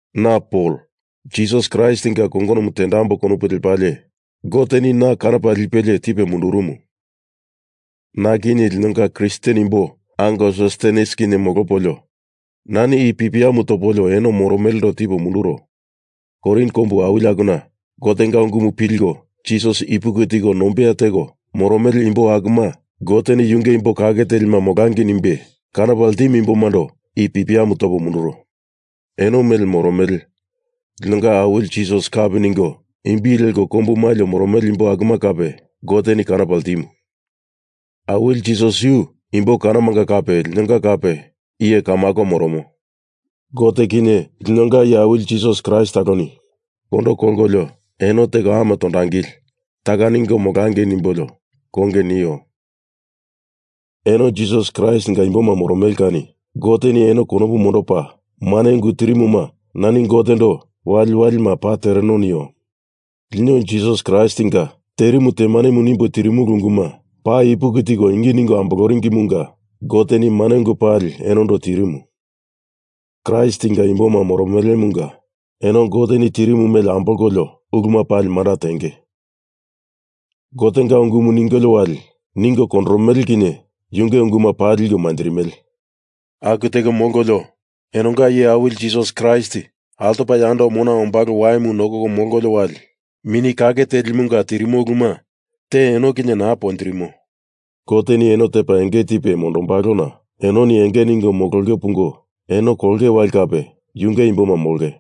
Na Pol, Jisas Kraistinga kongonomu tendamboi konopu lepalie Goteni na kanopa lipelie tipe mundurumu. Na kinye linonga Kristen imbo ango Sostenes kinye molopolio nani i pipiamu topolio eno moromelendo tipo munduro. Korin kombu awili akuna Gotenga ungumu pilko Jisas ipuki tiko nombeya teko moromele imbo akuma Goteni yunge imbo kake telima molangei nimbe kanopa ltimumando i pipiamu tipo munduro. Eno mele moromele linonga Awili Jisas kapi ningo imbi leko kombu malio moromele imbo akuma kape Goteni kanopa ltimu. Awili Jisas yu imbo kanomanga kape linonga kape iye kamako moromo. Gote kinye linonga Iye Awili Jisas Kraist taloni kondo kolkolio eno teko ame tondangili taka ningo molangei nimbolio konge nio. Eno Jisas Kraistinga imboma moromele kani Goteni eno konopu mondopa mane ungu tirimuna nani Gotendo waliwalima paa tereno nio. Lino Jisas Kraistinga terimu temanemu nimbo tirimulu unguma paa ipuki tiko ingi ningo amboloringimunga Goteni mane ungu pali enondo tirimu. Kraistinga imboma moromelemunga eno Goteni tirimu mele ambolkolio uluma pali manda tenge. Gotenga ungumu ningolio wali ningo kondoromele kinye yunge unguma paa liko manjirimele. Aku teko molkolio eno Linonga Iye Awili Jisas Kraist altopa yando mona ombalo waimu nokoko molkolio wali Mini Kake Telimunga tirimo uluma te eno kinye naa ponjirimo. Goteni eno tepa enge tipe mondombalona enoni enge ningo mololiko pungo eno kolongei wali kape yunge imboma molonge.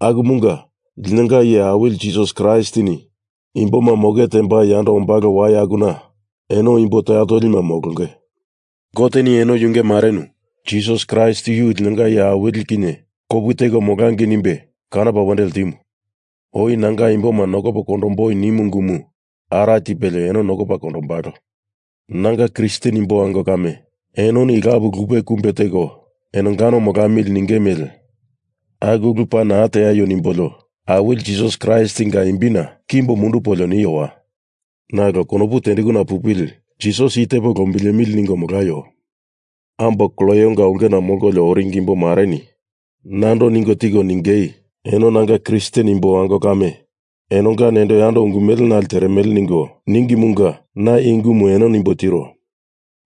Akumunga linonga Iye Awili Jisas Kraistini imboma moke tembai yando ombalo wai akuna eno imbo toya tolima molonge. Goteni eno yunge marenu Jisas Kraist yu linonga Iye Awili kinye kopu teko molangei nimbe kanopa wendo ltimu. Oi Nanga imboma nokopo kondomboi nimu ungumu ara tipelie eno nokopa kondombalo. Nanga Kristen imbo ango kame, enoni lapu lupe kumbe teko enongano molamili ningei mele aku ulu paa naa teaio nimbolio Awili Jisas Kraistinga imbina kimbo mundupolio niowa. Nalo konopu tendekuna pupili Jisas i tepo lombilemili ningo molaio. Ambo Kloenga ulkena molkolio oringi imbomareni nando ningo tiko ningei eno nanga Kristen imbo ango kame enonga nendo yando ungu mele nale teremele ningo ningimunga na i ungumu eno nimbo tiro.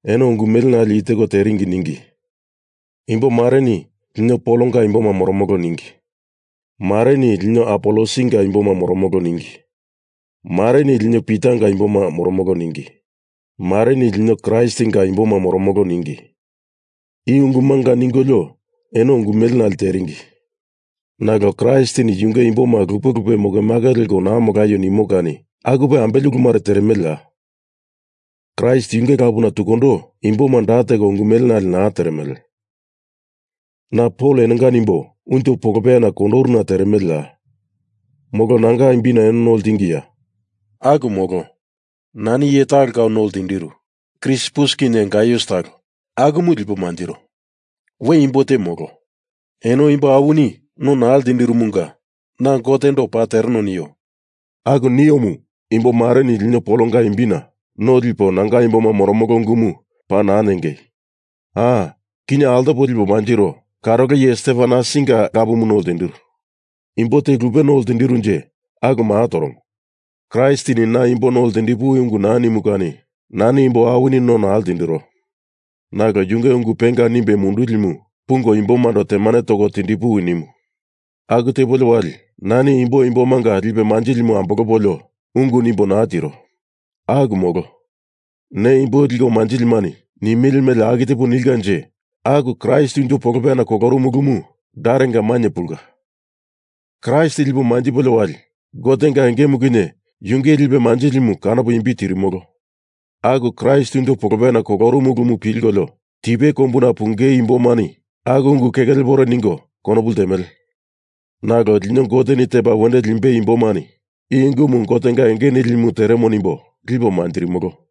Eno ungu mele nale i teko teringi ningi. Imbo mareni lino Polonga imboma moromolo ningi. Mareni lino Apolosinga imboma moromolo ningi. Mareni lino Pitanga imboma moromolo ningi. Mareni lino Kraistinga imboma moromolo ningi. I ungumunga ningolio eno ungu mele nale teringi. Nalo Kraistini yunge imboma lupe lupe mokemake leko naa molaio nimo kani akupe ambele ulu mare teremeleya? Kraist yunge lapuna tukundo imboma da teko ungu mele nale naa teremele. Na Pol enonga nimbo unjo polopeyana kondoruna teremeleya? Molo nanga imbina eno no ltingiya? Aku molo. Nani iye talo kau no ltindiru. Krispus kinye Gaius talo akumu lipo manjiro. We imbo te molo. Eno imbo awini no naa ltindirumunga na Gotendo paa tereno nio. Aku niomu imbo mareni lino Polonga imbina no lipo nanga imboma moromolo ungumu paa naa ningei. A! Kinye altopo lipo manjiro karolo iye Stefanasinga lapumu no ltindiru. Imbo te lupe no ltindirunje aku maa toromo. Kraistini na imbo no ltindipuwi ungu naa nimu kani nani imbo awini no naa ltindiro. Nalo yunge ungu penga nimbe mundulimu pungo imbomando temane toko tindipuwi nimu. Aku tepolio wali nani imbo imbomanga lipe manjilimu ambolopolio ungu nimbo naa tiro. Aku molo. Ne imbo liko manjilimani nimele mele aku tepo nilkanje aku Kraist unjo polopeyana kolorumu ulumu darenga mainye pulka. Kraist lipo manjipolio wali Gotenga engemu kinye yunge lipe manjilimu kanopo imbi tirimolo. Aku Kraist unjo polopeyana kolorumu ulumu pilkolio tipe kombuna pungei imbomani aku ungu keke lepore ningo konopu ltemele. Nalo lino Goteni tepa wendo limbei imbomani i ungumu Gotenga enge nilimu teremo nimbo lipo manjirimolo.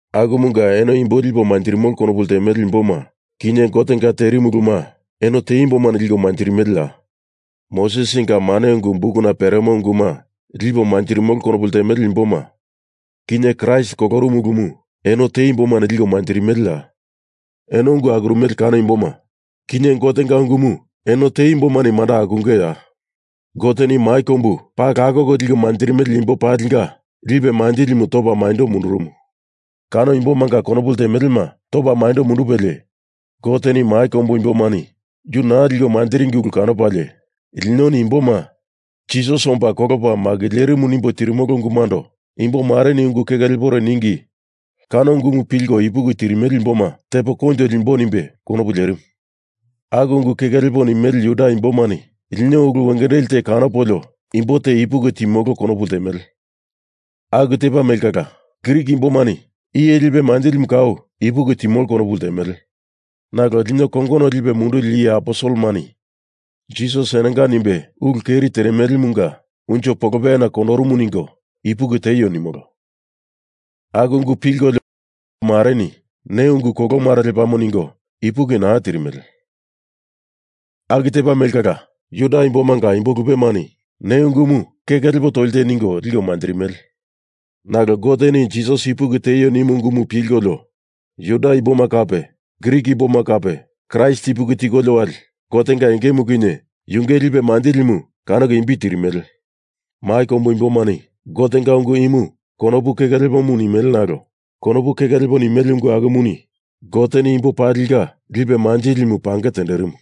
Akumunga eno imbo lipo manjirimolo konopu ltemele imboma, kinye Gotenga terimu uluma eno te imbomani liko manjirimeleya? Mosesinga mane ungu bukuna peremo unguma lipo manjirimolo konopu ltemele imboma, kinye Kraist kolorumu ulumu eno te imbomani liko manjirimeleya? Eno ungu akuromele kano imboma, kinye Gotenga ungumu eno te imbomani manda akungeya? Goteni mai kombu paa lakoko liko manjirimele imbo palinga lipe manjilimu topa maindo mundurumu. Kano imbomanga konopu ltemelema topa maindo mundupelie, Goteni mai kombu imbomani yu naa liko manjiringi ulu kanopalie linoni imboma Jisas omba kolopa makilerimu nimbo tirimolo ungumundo imbomareni ungu keke lepore ningi kano ungumu pilko ipuki tirimele imboma tepo koinjo limboi nimbe konopu lerimu. Aku ungu keke lepo nimele Juda imbomani lino ulu wengendeli te kanopolio imbo te ipuki timolo konopu ltemele. Aku tepa mele kala Grik imbomani iye lipe manjilimu kau ipuki timolo konopu ltemele. Nalo lino kongono lipe munduli iye aposelemani Jisas enonga nimbe ulu keri teremelemunga unjo polopeyana kondorumu ningo ipuki teio nimolo. Aku ungu pilkolio Juda imbomareni ne ungu kolo mare lepamo ningo ipuki naa tirimele. Aku tepa mele kala Juda imbomanga imbo lupemani ne ungumu keke lepo toli te ningo liko manjirimele. Nalo Goteni Jisas ipuki tieio nimu ungumu pilkolio Juda imboma kape Grik imboma kape Kraist ipuki tikolio wali Gotenga engemu kinye yunge lipe manjilimu kanoko imbi tirimele. Mai kombu imbomani Gotenga ungu imu konopu keke lepomu nimele nalo konopu keke lepo nimele ungu akumuni Goteni imbo palinga lipe manjilimu pange tenderimu.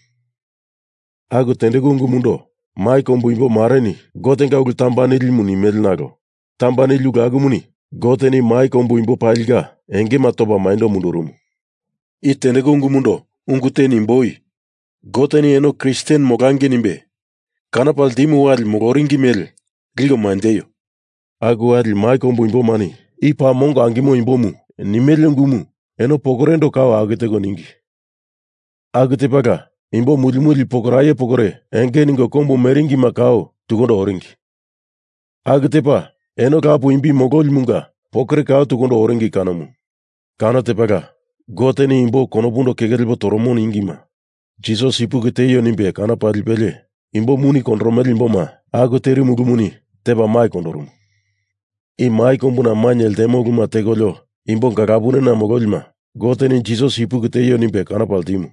Aku tendeku ungumundo mai kombu imbo mareni Gotenga ulu tamba nilimu nimele nalo tamba nili ulu akumuni Goteni mai kombu imbo palinga engema topa maindo mundurumu. I tendeku ungumundo ungu te nimboi. Goteni eno Kristen molangei nimbe kanopa ltimu wali moloringi mele liko manjeio. Aku wali mai kombu imbomani i paa mongo angimo imbomu nimele ungumu eno pokorendo kau aku teko ningi. Aku tepala imbo muli muli pokoraye pokore enge ningo kombu meringima kau tukundo oringi. Aku tepa eno lapu imbi mololimunga pokore kau tukundo oringi kanomu. Kano tepala Goteni imbo konopundo keke lepo toromo ningima Jisas ipuki tieio nimbe kanopa lipelie imbo muni kondoromele imboma aku terimu ulumuni tepa mai kondorumu. I mai kombuna mainye ltemo uluma tekolio imbo galapunena mololima Goteni Jisas ipuki tieio nimbe kanopa ltimu.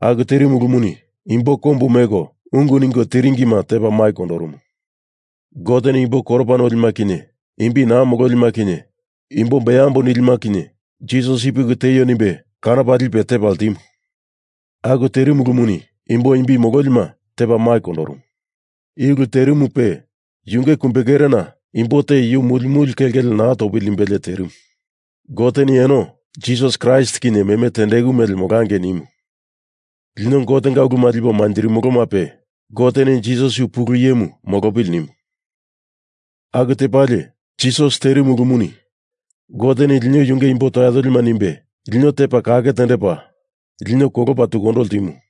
Aku terimu ulumuni imbo kombu meko ungu ningo tiringima tepa mai kondorumu. Goteni imbo koropa nolima kinye imbi naa mololima kinye imbo beambo nilima kinye Jisas ipuki tieio nimbe kanopa lipe tepa ltimu. Aku terimu ulumuni imbo imbi mololima tepa mai kondorumu. I ulu terimupe yunge kumbekerena imbo te yu muli muli kelkele naa topili nimbelie terimu. Goteni eno Jisas Kraist kinye meme tendeku mele molangei nimu. Lino Gotenga uluma lipo manjirimolomape Goteni Jisas yu pulu iyemu molopili nimu. Aku tepalie, Jisas terimu ulumuni Goteni lino yunge imbo toya tolima nimbe, lino tepa kake tendepa, lino kolopa tukundo ltimu.